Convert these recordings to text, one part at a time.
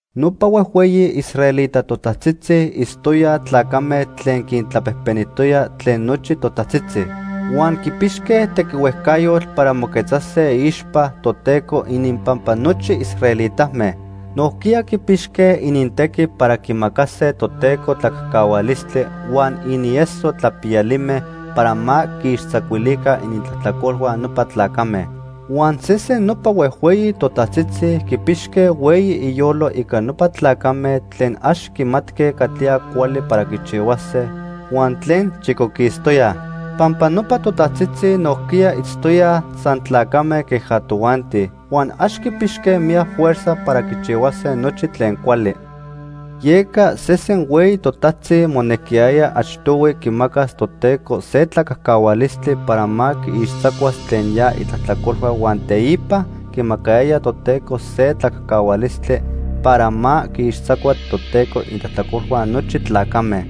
Nopa huejhueyi israelita totajtzitzi itztoyaj tlacame tlen quintlapejpenijtoyaj tlen nochi totajtzitzi. Huan quipixque tequihuejcayotl para moquetzase iixpa Toteco ininpampa nochi israelitame. Nojquiya quipixque inintequi para quimacase Toteco tlacajcahualistli huan inieso tlapiyalime para ma quiixtzacuilica inintlajtlacolhua nopa tlacame. Huan sesen nopa huejhueyi totajtzitzi quipixqui hueyi iyolo ica nopa tlacame tlen ax quimatque catlía cuali para quichihuase huan tlen chicoquistoyaj. Pampa nopa totajtzitzi nojquiya itztoyaj san tlacame queja tojuanti, huan ax quipixque miyac fuerza para quichihuase nochi tlen cuali. Yeca sesen hueyi totajtzi monequiyaya achtohui quimacas Toteco se tlacajcahualistli para ma quiixtzacuas tlen ya itlajtlacolhua huan teipa quimacayaya Toteco se tlacajcahualistli para ma quiixtzacua tlen Toteco inintlajtlacolhua nochi tlacame.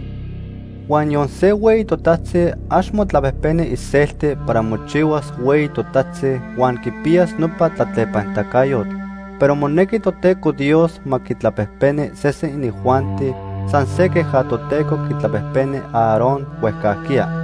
Huan niyon se hueyi totajtzi ax motlapejpeni iselti para mochihuas hueyi totajtzi huan quipiyas nopa tlatlepanitacayotl, pero monejqui Toteco Dios ma quitlapejpeni sesen inijuanti, san se queja Toteco quitlapejpeni Aarón huejcajquiya.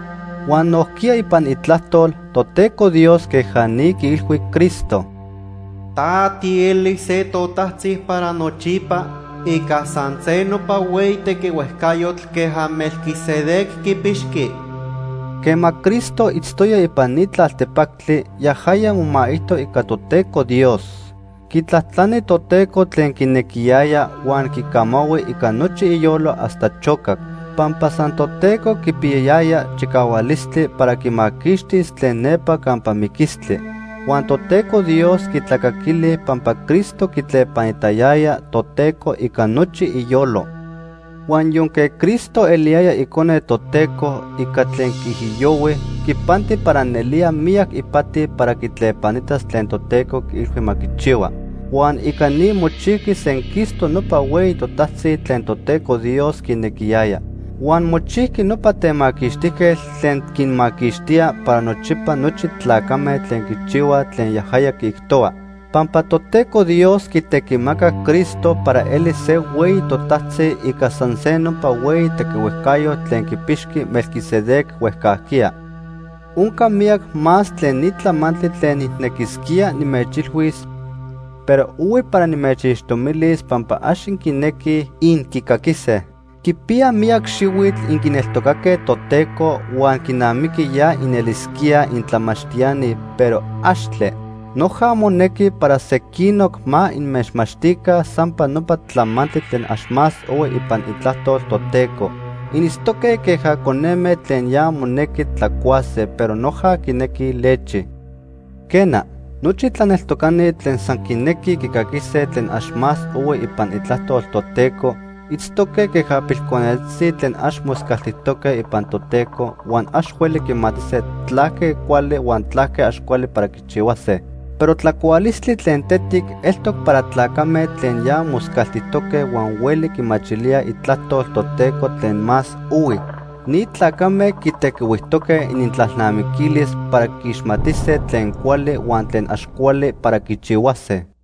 Huan nojquiya ipan Itlajtol, Toteco Dios queja ni quiilhui Cristo: “Ta tielis se totajtzi para nochipa ica san se nopa hueyi tequihuejcayotl queja Melquisedec quipixqui.” Quema Cristo itztoya ipan ni tlaltepactli, yajaya momaijto ica Toteco Dios. Quitlajtlani Toteco tlen quinequiyaya huan quicamahui ica nochi iyolo hasta chocac. Pampa san Toteco quipiyayaya chicahualistli para quimaquixtis tlen nepa campa miquistli. Huan Toteco Dios quitlacaquili pampa Cristo quitlepanitayaya Toteco ica nochi iyolo. Huan yonque Cristo eliyaya Icone Toteco, ica tlen quiijiyohui, quipanti para nelía miyac ipati para quitlepanitas tlen Toteco quiilhui ma quichihua. Huan ica ni mochijqui senquistoc nopa hueyi totajtzi tlen Toteco Dios quinequiyaya. Huan mochijqui nopa Temaquixtijquetl tlen quinmaquixtía para nochipa nochi tlacame tlen quichihuaj tlen yajaya quiijtohua, pampa Toteco Dios quitequimacac Cristo para elis se hueyi totajtzi ica san se nopa hueyi tequihuejcayotl tlen quipixqui Melquisedec huejcajquiya. Onca miyac más tlen ni tlamantli tlen nijnequisquía nimechilhuis, pero ohui para nimechixtomilis pampa ax inquinequij inquicaquise. Quipiya miyac xihuitl inquineltocaque Toteco huan quinamiqui ya inelisquíaj intlamachtiani pero, axtle. Noja monequi para sequinoc ma inmechmachtica sampa nopa tlamantli tlen ax más ohui ipan Itlajtol Toteco. Initztoque queja coneme tlen ya monequi tlacuase, pero noja quinequij lechi. Quena, nochi tlaneltocani tlen san quinequij quicaquise tlen ax más ohui ipan Itlajtol Toteco itztoque queja pilconetzitzi tlen ax moscaltijtoque ipan Toteco, huan ax hueli quimatise tlaque cuali huan tlaque ax cuali para quichihuase. Pero tlacualistli tlen tetic eltoc para tlacame tlen ya moscaltijtoque huan hueli quimachilíaj Itlajtol Toteco tlen más ohui. Ni tlacame quitequihuijtoque inintlalnamiquilis para quiixmatise tlen cuali huan tlen ax cuali para quichihuase.